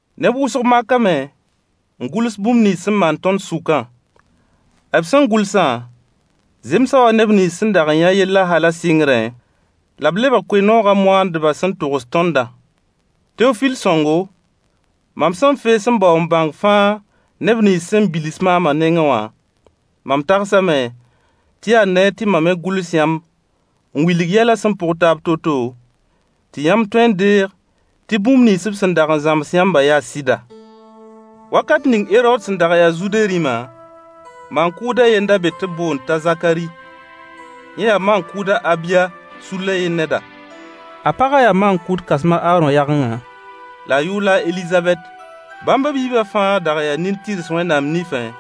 Neb wʋsg makame n gʋls bũmb nins sẽn maan tõnd sʋkã. B sẽn gʋlsã zemsa wa neb nins sẽn dag n yã yellã hal a sɩngrẽ, la b lebg koe-noogã moaandbã sẽn togs tõndã. Teofill sõngo, mam sẽn fees n bao n bãng fãa neb nins sẽn bils maamã nengẽ wã, mam tagsame tɩ yaa neer tɩ mam me gʋls yãmb n wilg yɛlã sẽn pʋg taab to-to, tɩ yãmb tõe n deeg tɩ bũmb nins b sẽn dag n zãms yãmbã yaa sɩda. Wakat ning Herood sẽn dag n ya Zude rĩma, maan-kʋʋd a ye n da be tɩ b boond t'a Zakari. Yẽ yaa maan-kʋʋd a Abiya sull a ye neda. A pagã yaa maan-kʋʋd kãsem a Aarõ yagenga, la a yʋʋr la a Elizabɛt. Bãmb b yiibã fãa dag n yaa nin-tɩrs Wẽnnaam nifẽ,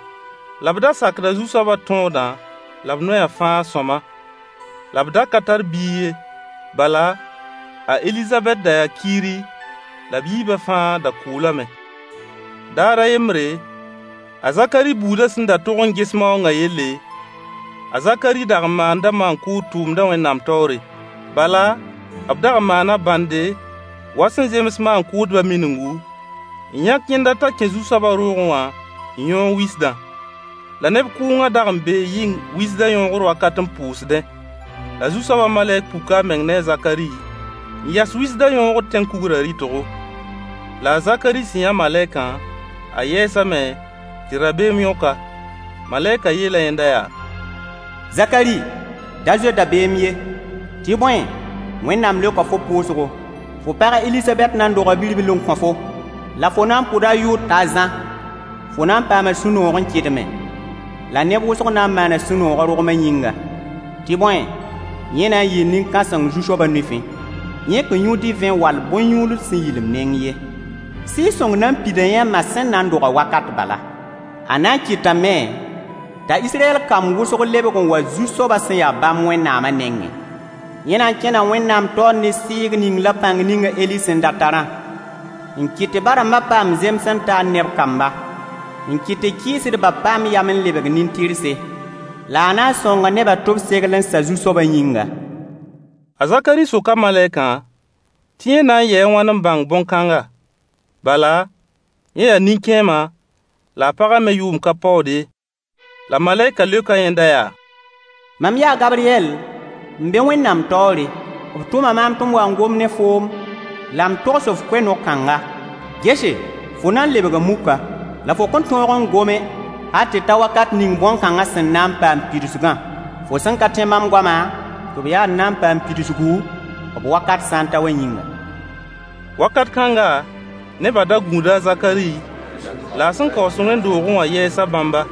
la b da sakda Zu-soabã tõodã la b noyã fãa sõama. La b ra ka tar biig ye. Bala, a Elizabɛt da yaa kiiri, la b yiibã fãa da kʋʋlame. Daar a yembre, a Zakari buudã sẽn da tog n ges maoongã yelle, a Zakari dag n maanda maan-kʋʋr tʋʋmdã Wẽnnaam taoore. Bala, b dag n maana bãnde, wa sẽn zems maan-kʋʋdbã miningu, n yãk yẽnda t'a kẽ Zu-soabã roogẽ wã n yõog wusdã. La neb kʋʋngã dag n bee yɩng wisdã yõogr wakat n pʋʋsdẽ. La Zu-soabã malɛk puka a meng ne a Zakari, n yas wusdã yõogr tẽn-kugrã rɩtgo. La a Zakari sẽn yã malɛkã, a yɛɛsame, tɩ rabeem yõk-a. Malɛkã yeela yẽnda yaa: Zakari, da zoe rabeem ye, tɩ bõe, Wẽnnaam leoka fo pʋʋsgo. Fo pag a Elizabɛt na n doga bi-ribl n kõ-fo. La fo na n pʋda a yʋʋr t'a Zã. Fo na n paama sũ-noog n kɩdme, la neb wʋsg na n maana sũ-noog a rogmã yĩnga. Tɩ bõe, yẽ na n yɩɩ nin-kãseng Zu-soabã nifẽ. Yẽ kõn yũ divẽ wall bõn-yũudl sẽn yilimd neng ye. Sɩɩg-sõng na n pida yẽ a ma sẽn na n dog-a wakat bala. A na n kɩtame t'a Israyɛl kamb wʋsg lebg n wa Zu-soabã sẽn ya bãmb Wẽnnaamã nengẽ. Yẽ na n kẽna Wẽnnaam taoor ne sɩɩg ning la pãng ning a Eli sẽn da tarã, n kɩt tɩ ba-rãmbã paam zems-n-taar ne b kamba, n kɩt tɩ kɩɩsdbã paam yam n lebg nin-tɩrse. La a na n sõnga nebã tɩ b segl n sa Zu-soabã yĩnga. A Zakari soka malɛkã tɩ yẽ na n yɩɩ a wãn n bãng bõn-kãnga? Bala, yẽ yaa nin-kẽema, la a pagã me yʋʋm ka paood ye. La malɛkã leoka yẽnda yaa: Mam yaa a Gabriyɛl, n be Wẽnnaam taoore. B tʋma maam tɩ m wa n gom ne foom la m togs-f koe-no-kãnga. Gese, fo na n lebga muka, la fo kõn tõog n gome, hal tɩ ta wakat ning bõn-kãngã sẽn na n paam pisdgu, fo sẽn ka tẽ mam goama, tɩ b yaool n na n paam pidsgu, b wakat sã n ta wã yĩnga. Wakat kãnga, nebã da gũuda a Zakari, la a sẽn kaoosd wẽnd-doogẽ wã yɛɛsa bãmba.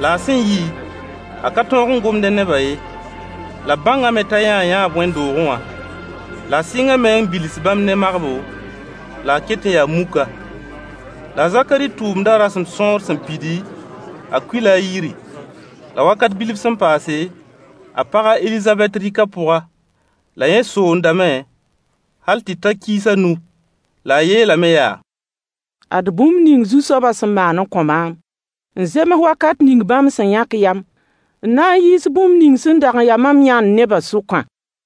La a sẽn yi, a ka tõog n gom ne nebã ye. La b bãngame t'a yãa yãab wẽnd-doogẽ wã. La a sɩngame n bils bãmb ne magbo, la a ket n yaa muka. La a Zakari tʋʋmdã rasem sõor sẽn pidi, a kuila a yiri. La wakat bilf sẽn paase, a pag a Elizabɛt rɩka pʋga. La yẽ soondame hal tɩ ta kiis a nu. La a yeelame yaa: Ad bũmb ning Zu-soabã sẽn maan n kõ maam, n zems wakat ning bãmb sẽn yãk yam n na n yiis bũmb ning sẽn dag n ya mam yãnd nebã sʋkã.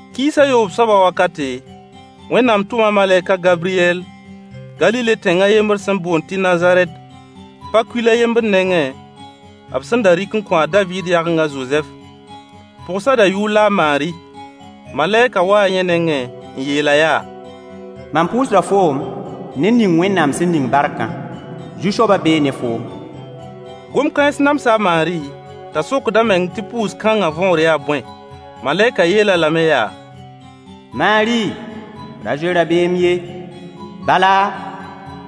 Kiis a yoob soabã wakate, Wẽnnaam tʋma malɛk a Gabriyɛl, Galile tẽng a yembr sẽn boond tɩ Nazarɛt, pa-kuil a yembr nengẽ, b sẽn da rɩk n kõ a Daviid yageng a Zozɛf. Pʋg-sadã yʋʋr la a Maari. Malɛkã waa yẽ nengẽ n yeel-a yaa: Mam pʋʋsda foom, ned ning Wẽnnaam sẽn ning barkã. Zu-soabã bee ne foom. Gom kãens namsa a Maari t'a sokd a meng tɩ pʋʋs-kãngã võor yaa bõe? Malɛkã yeel-a lame yaa: Maari, da zoe rabeem ye. Bala,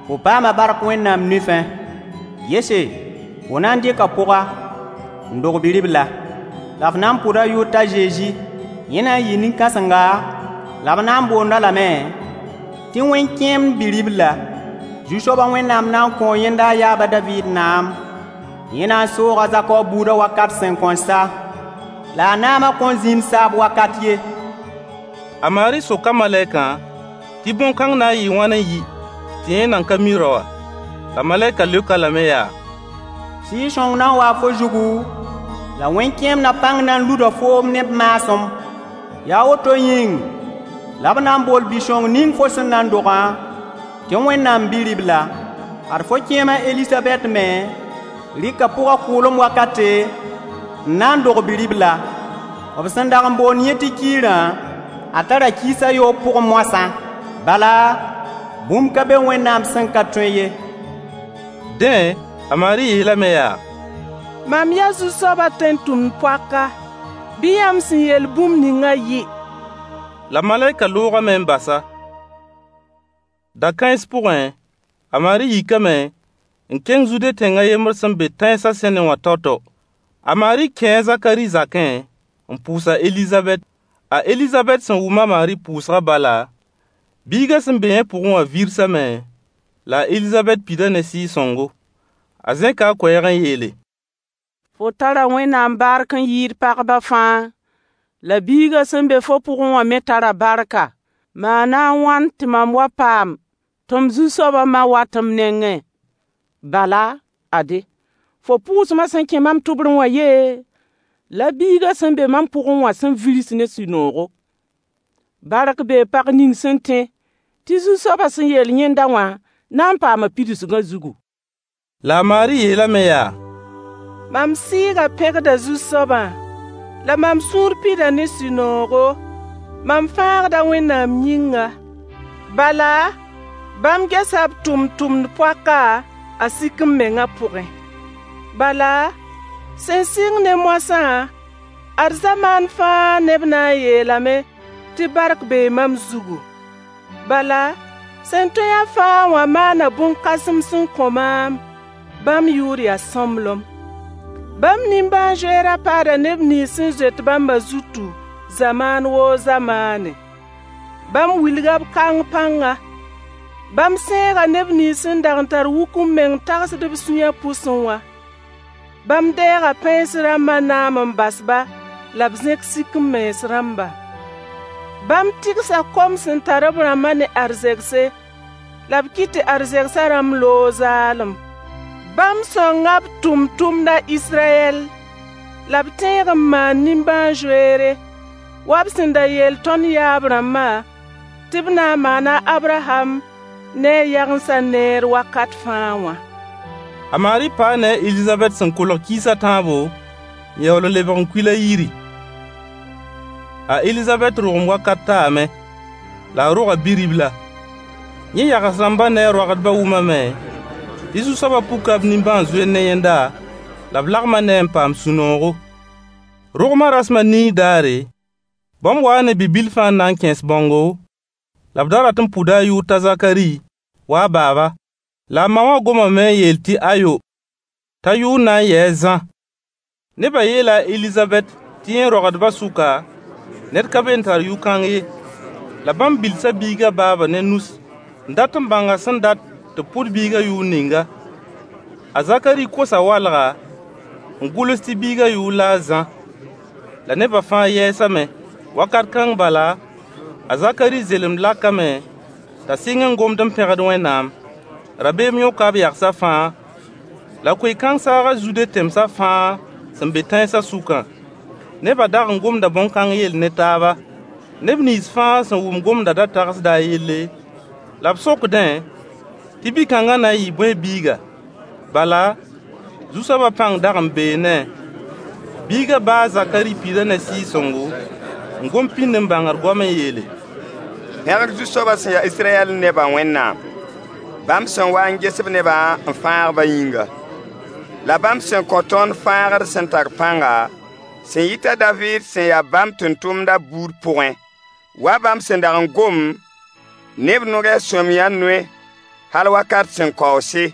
fo paama bark Wẽnnaam nifẽ. Gese, fo na n dɩka pʋga, n dog bi-ribla, la f na n pʋda a yʋʋr t'a Zezi. Yẽ na n yɩɩ nin-kãsenga, la b na n boond-a lame tɩ Wẽn-kẽemd Bi-ribla. Zu-soab a Wẽnnaam na n kõo yẽnda a yaab a Daviid naam. Yẽ na n sooga a Zakob buudã wakat sẽn kõn sa, la a naamã kõn zĩnd saab wakat ye. A Maari soka malɛkã tɩ bõn-kãng na n yɩɩ wãn n yɩ tɩ yẽ nan ka mi raoa? La malɛkã leok-a lame yaa: Sɩɩg-sõng na n waa fo zugu, la Wẽn-kẽemdã pãngã na n luda foom ne b maasem. Yaa woto yĩng la b na n bool bi-sõng ning fo sẽn na n dogã tɩ Wẽnnaam Bi-ribla. Ad fo kẽem a Elizabɛt me rɩka pʋg a kʋʋlem wakate, n na n dog bi-ribla. B sẽn dag n boond yẽ tɩ kiirã, a tara kiis a yoob pʋg mosã. Bala, bũmb ka be Wẽnnaam sẽn ka tõe ye. Dẽ, a Maari yeelame yaa: Mam yaa Zu-soabã tʋmtʋmd poaka. Bɩ yãmb sẽn yeel bũmb ningã yɩ. La malɛkã loogame n bas-a. Da-kãens pʋgẽ, a Maari yikame n kẽng Zude tẽng a yembr sẽn be tãensã sẽne wã tao-tao. A Maari kẽe a Zakari zakẽ, n pʋʋs a Elizabɛt. A Elizabɛt sẽn wʋm a Maari pʋʋsgã bala, biigã sẽn be yẽ pʋgẽ wã virsame, la a Elizabɛt pida ne Sɩɩg-sõngo. A zẽka a koɛɛg n yeele: Fo tara Wẽnnaam bark n yɩɩd pagbã fãa. La biigã sẽn be fo pʋgẽ wã me tara barka. Maana a wãn tɩ mam wa paam tɩ m Zu-soabã ma wat m nengẽ? Bala, ade, fo pʋʋsmã sẽn kẽ mam tʋbrẽ wã yee, la biigã sẽn be mam pʋgẽ wã sẽn virs ne sũ-noogo. Bark bee pag ning sẽn tẽ tɩ Zu-soabã sẽn yeel yẽnda wã na n paama pidsgã zugu. La a Maari yeelame yaa: Mam sɩɩgã pẽgda Zu-soabã, la mam sũur pida ne sũ-noogo, mam fãagd a Wẽnnaam yĩnga. Bala, bãmb gesa b tʋmtʋmd-poakã a sik-m-mengã pʋgẽ. Bala, sẽn sɩng ne moasã, ad zamaan fãa neb na n yeelame tɩ bark bee mam zugu. Bala, sẽn Tõe-a-fãa wã maana bõn-kãsems n kõ maam. Bãmb yʋʋr yaa sõmblem. “Bãmb nimbãan-zoeerã paada neb nins sẽn zoet bãmbã zutu, zamaan o zamaane.” Bãmb wilga b kang pãnga. Bãmb sãeega neb nins sẽn dag n tar wuk-m-meng tagsd b sũyã pʋsẽ wã. Bãmb deega pãens rãmbã naam n bas-ba, la b zẽk sik-m-mens rãmbã. Bãmb tɩgsa kom sẽn tar b rãmbã ne arzegse, la b kɩt tɩ arzegsã rãmb loog zaalem. Bãmb sõnga b tʋmtʋmd a Israyɛl, la b tẽeg n maan nimbãan-zoeere, wa b sẽn dag n yeel tõnd yaab-rãmbã tɩ b na n maana a Abraham ne a yagensã neer wakat fãa wã. A Maari paa ne a Elizabɛt sẽn kolg kiis a tãabo, n yaool n lebg n kuil a yiri. A Elizabɛt rogem wakat taame. La a roga bi-ribla. Yẽ yags-rãmbã ne a roagdbã wʋmame tɩ Zu-soabã puka b nimbãan-zoeer ne yẽnda, la b lagma ne-a n paam sũ-noogo. Rogmã rasem a nii daare, bãmb waa ne bi-bilfã n na n kẽes bãongo, la b da rat n pʋda a yʋʋr t'a Zakari wa a baaba. La a ma wã gomame n yeel tɩ ayo! T'a yʋʋr na n yɩɩ a Zã. Nebã yeela a Elizabɛt tɩ yẽ roagdbã sʋka, ned ka be n tar yʋ-kãng ye. La bãmb bilsa biigã baaba ne nus n dat n bãng a sẽn dat tɩ b pʋd biigã yʋʋr ninga. A Zakari kosa walga, n gʋls tɩ biigã yʋʋr la a Zã. La nebã fãa yɛɛsame. Wakat kãng bala, a Zakari zelemd lakame t'a sɩng n gomd n pẽgd Wẽnnaam. Rabeem yõka b yagsã fãa. La koe-kãng saaga Zude tẽmsã fãa sẽn be tãensã sʋkã. Nebã dag n gomda bõn-kãng yell ne taaba. Neb nins fãa sẽn wʋm gomdã da tagsda a yelle, la b sokdẽ tɩ bi-kãngã na n yɩɩ bõe biiga? Bala, Zu-soabã pãng dag n bee ne-a. Biigã ba a Zakari pida ne Sɩɩg-sõngo, n gom pĩnd-n-bãngr goam n yeele: Pẽgr Zu-soabã sẽn ya Israyɛl nebã Wẽnnaam, bãmb sẽn wa n ges b nebã n fãag-bã yĩnga, la bãmb sẽn kõ tõnd fãagd sẽn tar pãnga, sẽn yit a Daviid sẽn ya bãmb tʋmtʋmdã buud pʋgẽ wa bãmb sẽn dag n gom ne b no-rɛɛs-sõamyã noey hal wakat sẽn kaoose,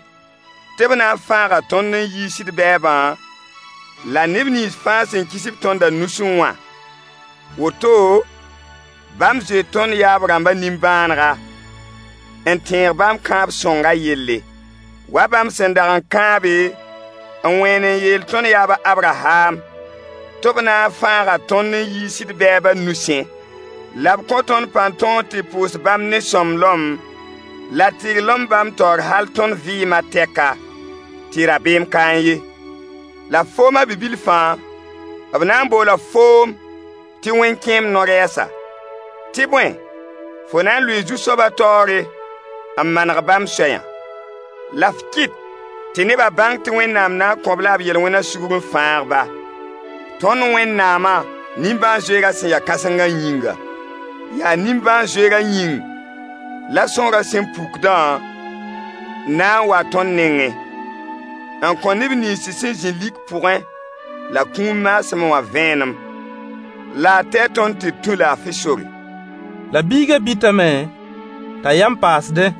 tɩ b na n fãaga tõnd n yiis d bɛɛbã la neb nins fãa sẽn kis-b tõndã nusẽ wã. Woto, bãmb zoee tõnd yaab-rãmbã nimbãanega, n tẽeg bãmb kãab-sõngã yelle, wa bãmb sẽn dag n kãabe, n wẽen n yeel tõnd yaab a Abraham tɩ b na n fãaga tõnd n yiis d bɛɛbã nusẽ, la b kõ tõnd pãn-tõog tɩ pʋʋs bãmb ne sõmblem la tɩrlem bãmb taoor hal tõnd vɩɩmã tɛka, tɩ rabeem kaẽ ye. La foom a bi-bilfã, b na n boola foom tɩ Wẽn-kẽemd no-rɛɛsa. Tɩ bõe, fo na n lʋɩɩ Zu-soabã taoore n maneg bãmb soayã, la f kɩt tɩ nebã bãng tɩ Wẽnnaam na n kõ-b-la b yel-wẽnã sugr n fãag-ba, tõnd Wẽnnaamã nimbãan-zoeerã sẽn ya kãsengã yĩnga. Yaa nimbãan-zoeerã yĩng la sõorã sẽn pukdã na n wa tõnd nengẽ, n kõ neb nins sẽn zĩ lik pʋgẽ la kũum maasmẽ wã vẽenem, la a tae tõnd tɩ d tũ laafɩ sore. La biigã bɩtame t'a yam paasdẽ.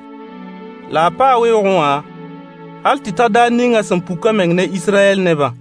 La a paa weoogẽ wã hal tɩ ta daar ning a sẽn puk a meng ne Israyɛl nebã.